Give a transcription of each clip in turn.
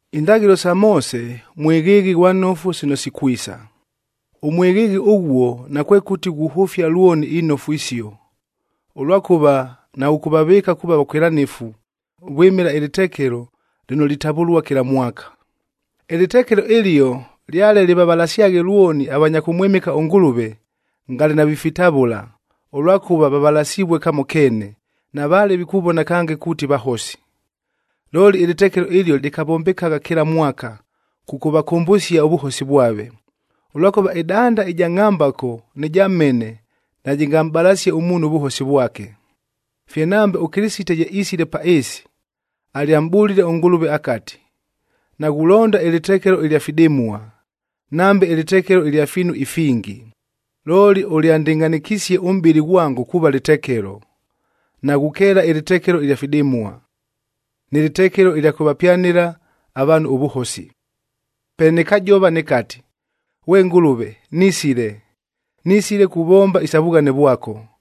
Indaghɨlo sa Moose mwɨghɨɨghɨ ghwa nofu sino sikwisa. Ʉmwɨghɨɨghɨ ʉghuo nakwekʉti ghuhʉfia lwoni inofu isio, ʉlwakʉva naghʉkʉvavɨɨka kuuva vakwɨlanɨfu vwɨmɨla ɨlɨtekelo lɨno litavʉlua kɨla mwaka. Ɨlɨtekelo ɨlio lyale lɨvavalasyaghe lwoni avanya kʉmwɨmɨka ʉNgʉlʉve, ngale navifitavʉla, ʉlwakʉva vavalasivue kamo keene, navaale vikuvona kange kuuti vahosi. Looli ɨlɨtekelo ɨlio lɨkavombekagha kɨla mwaka, kʉkʉvakʉmbʉsia ʉvʉhosi vwave, ʉlwakʉva ɨdanda ɨja ngʼhambako nɨ ja mhene najɨngamʼbalasie ʉmuunhu ʉvʉhosi vwake. Fye nambe, ʉKɨlɨsite ye isile pa ɨɨsi, alyamʼbʉlile ʉNgʉlʉve akati, “Naghulonda ɨlɨtekelo ɨlya fidɨmua, nambe ɨlɨtekelo ɨlya fiinu ifingi. Looli ʉlyandɨngʼhanɨkisie ʉmʼbɨlɨ ghwango kuuva lɨtekelo. Naghukeela ɨlɨtekelo ɨlya fidɨmua, nɨ lɨtekelo ɨlya kʉvapyanɨla avaanhu ʉvʉhosi. Pe nɨkajova nɨkati, ‘Ghwe Ngʉlʉve nisile, nisile kuvomba isa vughane vwako,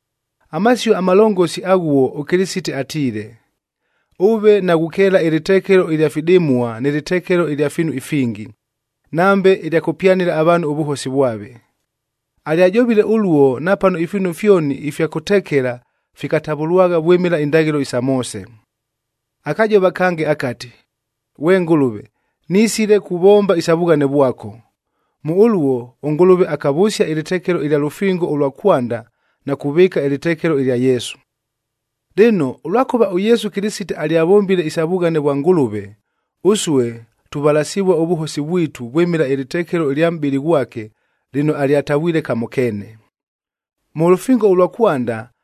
Amasio amalongosi aghuo ʉKɨlɨsite atiile, “Ʉve naghukeela ɨlɨtekelo ɨlya fidɨmua nɨ lɨtekelo ɨlya fiinu ifingi, nambe ɨlya kʉpyanɨla avaanhu ʉvʉhosi vwave.” Alyajovile ʉluo napano ifiinu fyoni ifya kʉtekela fikatavʉlwagha vwɨmɨla indaghɨlo isa Moose. Akajova kange akati, “Ghwe Ngʉlʉve, nisile kuvomba isa vughane vwako.” Mʉ ʉluo, ʉNgʉlʉve akavʉsia ɨlɨtekelo ɨlya lʉfingo ʉlwa kwanda na kuvɨɨka ɨlɨtekelo ɨlya Yesu. Lɨno, ʉlwakʉva ʉYesu Kɨlɨsite alyavombile isa vughane vwa Ngʉlʉve, ʉsue tuvalasivua ʉvʉhosi vwitu vwɨmɨla ɨlɨtekelo ɨlya mʼbɨlɨ ghwake lɨno alyatavwile kamo keene. Mʉ lʉfingo ʉlwa kwanda,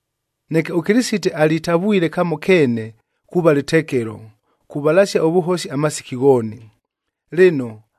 Neke ʉKɨlɨsite alitavwile kamo keene kuuva lɨtekelo, kuvalasia ʉvʉhosi amasiki ghooni. Lɨno,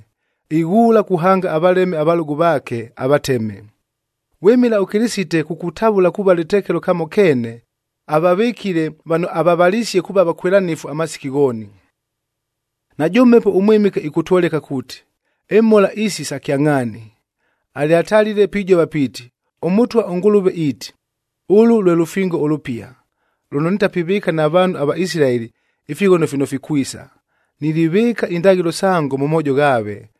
ighuula kuhanga avaleme avalʉgʉ vaake, avateme. Vwɨmɨla ʉKɨlɨsite kukutavʉla kuuva lɨtekelo kamo keene, avavɨkile vano avavalisie kuuva vakwɨlanɨfu amasiki ghooni. Najʉ Mhepo ʉMwɨmɨke ɨkʉtwoleka kuuti, imhola isi sa kyangʼhaani. Alyatalile pijova piiti, “ɄMʉtwa ʉNgʉlʉve iiti, ‘Ʉlʉ lwe lʉfingo ʉlʉpia lʉno nitapivɨɨka na vaanhu ava Isilaeli ifighono fino fikwisa. Nilivɨɨka indaghɨlo sango mʉ moojo ghaave,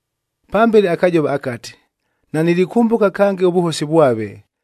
Pambele akajova akati, “Nanilikʉmbʉka kange ʉvʉhosi vwave,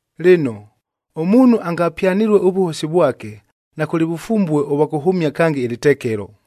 Lɨno, ʉmuunhu angapyanɨlue ʉvʉhosi vwake, nakʉlɨ vʉfumbue ʉvwa kʉhʉmia kange ɨlɨtekelo.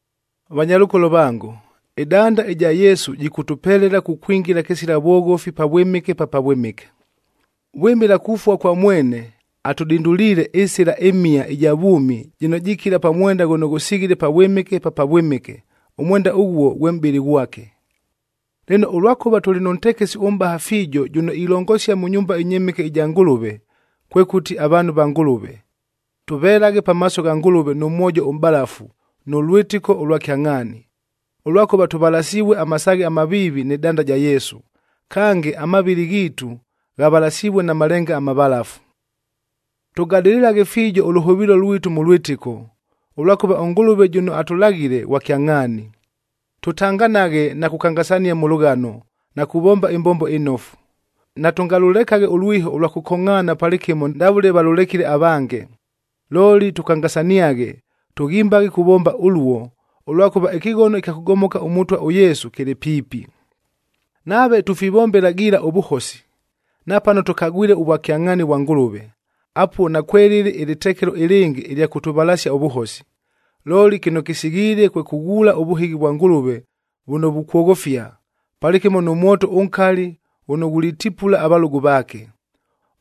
Vanyalʉkolo vango, ɨdanda ɨja Yesu jɨkʉtʉpelela kukwingila kɨsila vwoghofi Pavwɨmɨke pa Pavwɨmɨke. Vwɨmɨla kufua kwa mwene, atʉdinduliile ɨsɨla ɨmhia ɨja vwʉmi jɨno jikila pa mwenda ghʉno ghʉsighile Pavwɨmɨke pa Pavwɨmɨke, ʉmwenda ʉghuo ghwe mʼbɨlɨ ghwake. Lɨno, ʉlwakʉva tʉlɨ nʉ ntekesi ʉmʼbaha fiijo jʉno ilongosia mʉ nyumba ɨnyɨmɨke ɨja Ngʉlʉve, kwekʉti avaanhu va Ngʉlʉve, tʉvelaghe pamaaso gha Ngʉlʉve nʉ mwojo ʉmʼbavalafu nʉ lwɨtɨko ʉlwa kyangʼhaani, ʉlwakʉva tʉvalasivue amasaaghe amaviivi nɨ danda ja Yesu, kange amavɨlɨ ghiitu ghavalasivue na malenga amavalafu. Tʉgadɨlɨlaghe fiijo ʉlʉhʉvɨɨlo lwitu mʉ lwɨtɨko, ʉlwakʉva ʉNgʉlʉve jʉno atʉlaghile, ghwa kyangʼhaani. Tʉtanganaghe na kukangasania mʉ lʉghano na kuvomba ɨmbombo ɨnofu. Natʉngalʉlekaghe ʉlwiho ʉlwa kʉkongʼhaana palɨkɨmo ndavʉle valʉlekile avange. Looli tʉkangasaniaghe, tʉghimbaghe kuvomba ʉluo, ʉlwakʉva ɨkɨghono ɨkya kʉgomoka ʉMʉtwa ʉYesu kɨlɨ piipi. Nave tufivombela giila ʉvʉhosi, napano tʉkagwile ʉvwakyangʼhaani vwa Ngʉlʉve, apuo nakwelɨlɨ ɨlɨtekelo ɨlɨngɨ ɨlya kʉtʉvalasia ʉvʉhosi. Looli kɨno kɨsighiile kwe kʉghuula ʉvʉhɨghi vwa Ngʉlʉve vʉno vukwoghofia, palɨkɨmo nʉ mwoto ʉnkali ghʉno ghulitipula avalʉgʉ vaake.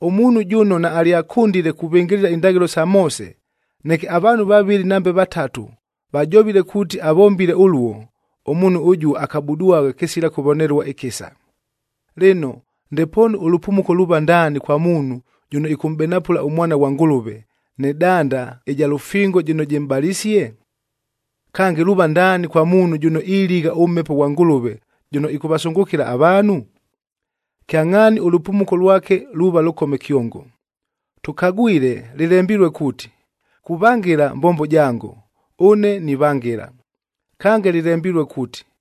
Ʉmuunhu jʉno naalyakʉndile kuvɨngɨlɨla indaghɨlo sa Moose, neke avaanhu vavɨlɨ nambe vatatu vajovile kuuti avombile ʉluo, ʉmuunhu ʉjuo akabudwagha kɨsila kʉvonelua ɨkɨsa. Lɨno, ndepoonu ʉlʉpumuko luuva ndaani kwa muunhu jʉno ɨkʉmʼbenapʉla ʉMwana ghwa Ngʉlʉve, nɨ danda ɨja lʉfingo jɨno jɨmʼbalisie? Kange, luuva ndaani kwa muunhu jʉno iligha ʉMhepo ghwa Ngʉlʉve jʉno ɨkʉvasʉngʉkɨla avaanhu? Kyangʼhaani ʉlʉpumuko lwake luuva lʉkome kyongo. Tʉkagwile lɨlembilue kuuti, “Kuvangɨla mbombo jango, ʉne nivangɨla.”f Kange lɨlembilue kuuti,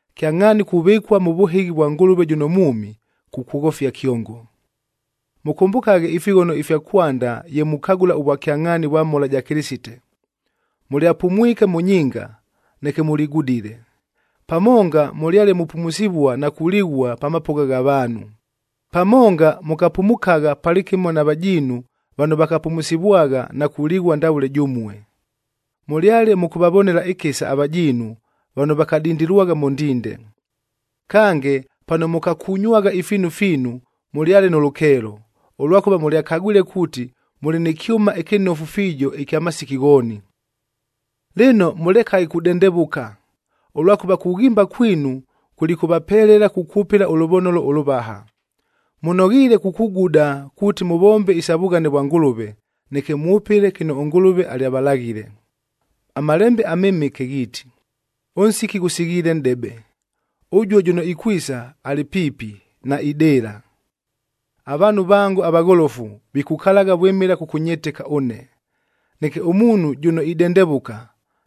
Kyangʼhaani kuvɨkua mʉ vʉhɨghi vwa Ngʉlʉve jʉno mwʉmi, kukwoghofia kyongo. Mʉkʉmbʉkaghe ifighono ifya kwanda ye mukagʉla ʉvwakyangʼhaani vwa mhola ja Kɨlɨsite. Mʉlyapumwike mʉ nyinga, neke mʉligudile. Pamonga mʉlyale mupumusivua na kulighua pa mapʉgha gha vaanhu. Pamonga mʉkapumukagha palɨkɨmo na vajiinu vano vakapumusivwagha na kulighua ndavʉle jʉmue. Mʉlyale mʉkʉvavonela ɨkɨsa avajiinu vano vakadindilwagha mʉ ndinde. Kange, pano mʉkakunywagha ifiinu fiinu, mʉlyale nʉ lʉkeelo, ʉlwakʉva mʉlyakagwile kuuti mʉlɨ nɨ kyʉma ɨkɨnofu fiijo ɨkya masiki ghooni. Lɨno, mʉlekaghe kudendevʉka, ʉlwakʉva kughimba kwinu kulikʉvapelela kukwʉpɨla ʉlʉvonolo ʉlʉvaha. Mʉnoghiile kukuguda kuuti mʉvombe isa vughane vwa Ngʉlʉve, neke mwʉpɨle kɨno ʉNgʉlʉve alyavalaghile. AMalembe aMɨmɨke ghiiti, “Ʉnsiki ghʉsighiile nʼdebe, ʉjuo jʉno ikwisa, alɨ piipi, naidɨɨla. Avaanhu vango avagholofu vikukalagha vwɨmɨla kʉkʉnyɨtɨka ʉne. Neke ʉmuunhu jʉno idendevʉka,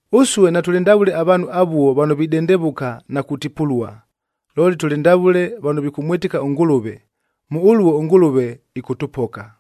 Ʉsue natʉlɨ ndavʉle avaanhu avuo vano videndevʉka na kutipulua, looli tʉlɨ ndavʉle vano vikʉmwɨtɨka ʉNgʉlʉve, mʉ ʉluo ʉNgʉlʉve ɨkʉtʉpoka.